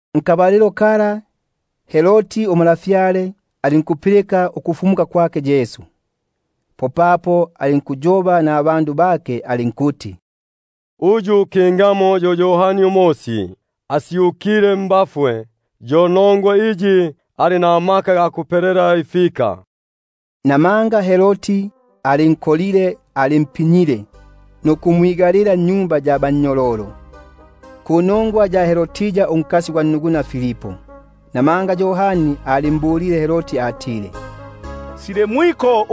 Nkabalilo kako untwa Herodi alinkupilika ukufumuka kwake Yesu; alinkuyoba kubabombi bake alinkuti: Uyu yo Yohani Umosi; asyukile mbafwe, yo nongwa iyi amaka amakulumba aga gikubomba imbombo mmyake. Namanga Herodi alinkolile Yohani, alimpinyile nukumwigalila nnyumba ya bannyololo panongwa ya Herodia unkannuguna gwake Filipu; papo Yohani alimbulile atile: Syo mwiko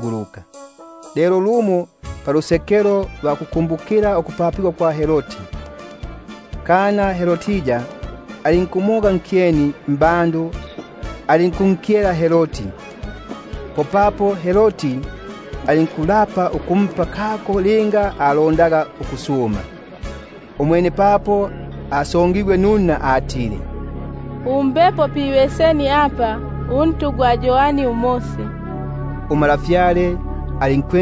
luka. Lelo pisiku lya kukumbukila ukupapigwa kwake Herodi, kana Herodia alinkumoga nkyeni mbandu, alinku- nkyela Herodi. Popapo alinkufinga nuluyigo ukumpa aka linga asumaga. Umwene bo asongigwe nunna, alinkuti: Mbapo pibeseni apa untu gwa Yohani Umosi. Untwa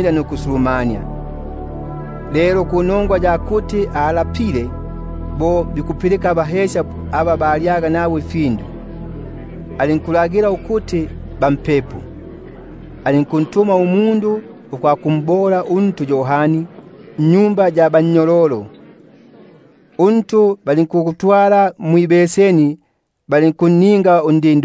alinkusulumania, loli panongwa ya luyigo na panongwa ya aba balyaga nagwe, alinkulagila ukuti bampepo; alinkuntuma umundu ukwakumbola Yohani untu nnyumba ya bannyololo. Untu gwake gulinkutwaligwa mwibeseni, alinkupegwa undi-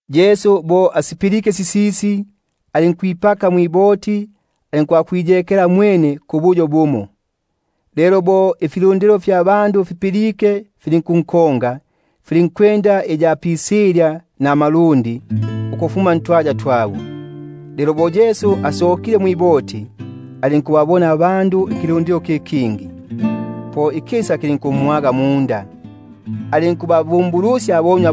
Umwene Yesu bo asipilike sisisi, alinkwipaka mwiboti, alinkusokapo alinkwakwiyekela pabusitabandu. Bo ifilundilo Apilike, filinkunkonga, Alinkwenda iya pisilya ukufuma ntwaya twabo. Bo asokile, alinkukibona ikilundilo ikikulumba; po ikisa kilinkumwaga, alinkubabumbulusya abonywa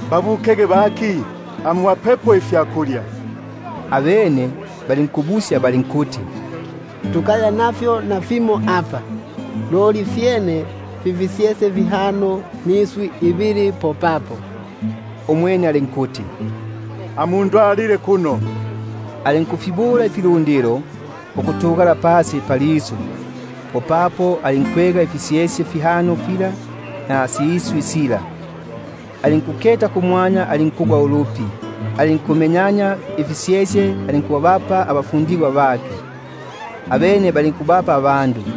ukuti babukege, amubapepo yuyumwe ifyakulya. Abene balinkumbula balinkuti: Tukaya nafyo nafimo apa, loli fyene fi fisyesye fihano niswi ibili. Umwene alinkuti: Amundwa- lile kuno. Alinkufilagila ifilundilo ukuti fitugale pasi palisu; popapo alinkwega ifisyesye fihano fila niswi ibili sila, alinkuketa kumwanya alinkugwa ulupi, alinkufimenyania ifisyesye alinkubapa abafundigwa bake, abene balinkufipa ifilundilo.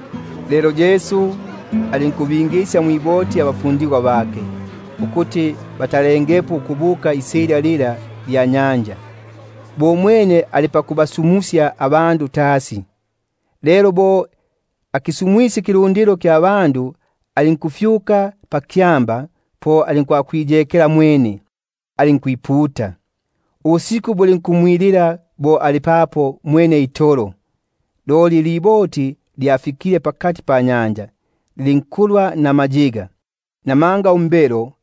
Popapo alinkubafimbilisya abafundigwa bake ukwipaka mwiboti, ukutalapo ukubuka isilya lila, bo umwene ikukisu- musya ikilundilo. Lelo bo afisumwisye ifilundilo, alinkufyuka pakyamba alinkwakwiputa mwene; lelo bo bwilile namayolo, alinkuya papo mwene itolo. Loli iliboti lyafikile pakati panyanja, lyatamigwaga namayiga, namanga umbelo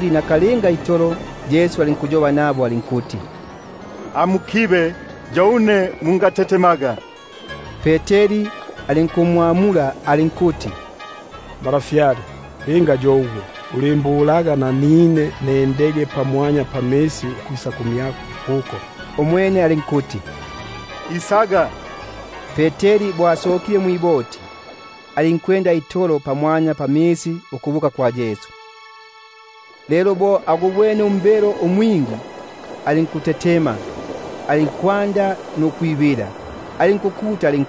Nakalinga Yesu alinkuyoba nabo alinkuti: Amukibege itolo, yo une; komma ukutetema. Umwene Peteri alinkumwamula alinkuti: Malafyale, linga yo ugwe, ulindagilaga ukuti nendege pamwanya pamisi ukwisa kumyako. Alinkuti: Isaga. Umwene Peteri bo asokile mwiboti, alinkwenda itolo pamwanya pamisi ukubuka kwa Yesu. Lelo bo agubwene umbelo alinkutetema, alinkwanda ukwibila, alinkukuta ali-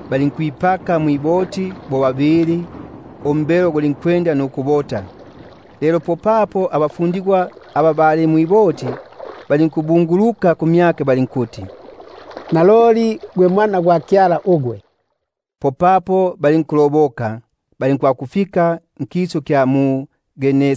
bipakile mwiboti, popapo umbelo gulinkubota. Abene loli aba bali mwiboti balinkumbungulukila balinkuti: Naloli, gwe Mwana gwa Kyala ugwe. Popapo balinkwambuka balinkwakufika nkisu kya Gene-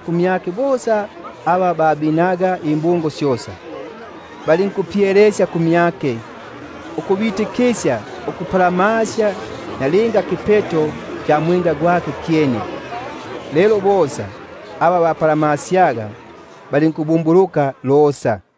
fila bosa ababine. Balinkupyelesya kumyake, ukuti bapalamasyege nalinga kipeto kya mwenda gwake; lelo bosa aba bapalamasyaga balinkupona.